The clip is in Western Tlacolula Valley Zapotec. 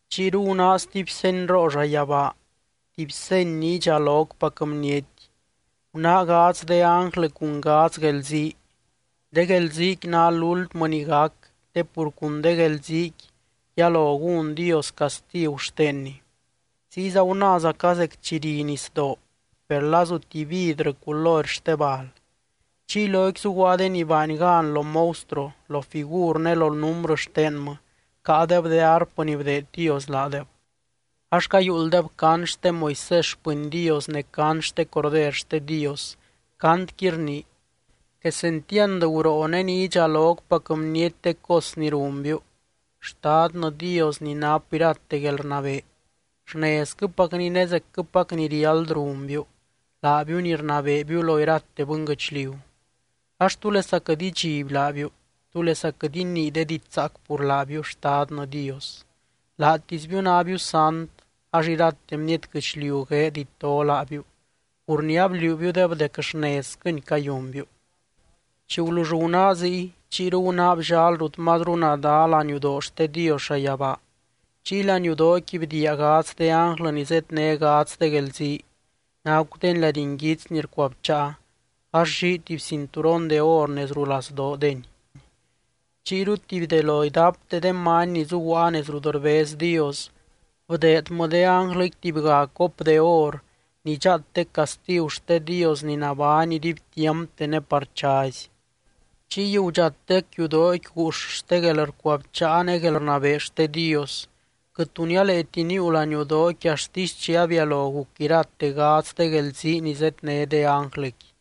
Chiyru gunáa stuby senyroo llayabaa, tuby seny ni idxalocpac bniety: Gunáa gadz de ánglɨ cun gadz guelzii. De guelziiqui ná lúltmɨ ni gac te pur cun de guelziiqui, yalo gún Dios castigu xtenny. Ziyza gunáazaca zec chi ri nisdoo, per lazu tuby vidrɨ culory xte bal. Chiy loqui zuguaa de ni baany gan lo monstruo, lo figur ne lo númbrɨ xtenmɨ, caadeb de arpɨ ni bdeed Dios laadeb. Ax cayuulddeb cant xte Moisés xpɨny Dios ne cant xte Corder xte Dios, cantqui rnii: Quesentiand guroo ne ni idxalocpac bniety de cos ni runbiu, Xtadnɨ Dios ni nap irate guelrnabee. Xnezquɨpacni ne zecquɨpac ni riáld runbiu, laabiu ni rnabeebiu lo irate bɨnguɨchliu. Ax, ¿túlesa quɨt idxiby laabiu? ¿Túlesa quɨt inii de diidx zaac pur laabiu, Xtadnɨ Dios? Laatisbiu nábiu sant ax irate bniety guɨchliu gueed ito laabiu pur ni abliuubiudeb dec xnezquɨni cayunbiu. Chi gulull gunáa ziy, chiyru gunáa bllal rut mazru nadá laniudoo xte Dios llayabaa. Chiy laniudooqui bdiia gadz de ánglɨ ni zedné gadz de guelzii: Nacudeny lady nguits ni rcuabcháa, ax llii tuby cinturon de or nez rulazdoodeny. Chiyru tuby de lo idapte de many ni zuguaa nez rut rbez Dios, bdeedmɨ de ánglɨqui tubyga cop de or ni dxaatec castigu xte Dios ni nabány iduibtiampte ne par chazy. Chiy gudxatec yudooqui guux xte guelrcuabcháa ne guelrnabee xte Dios. Quɨt tu nialeeti níiu laniudooqui axtisy chi abialo guc irate gadz de guelzii ni zedné de ánglɨqui.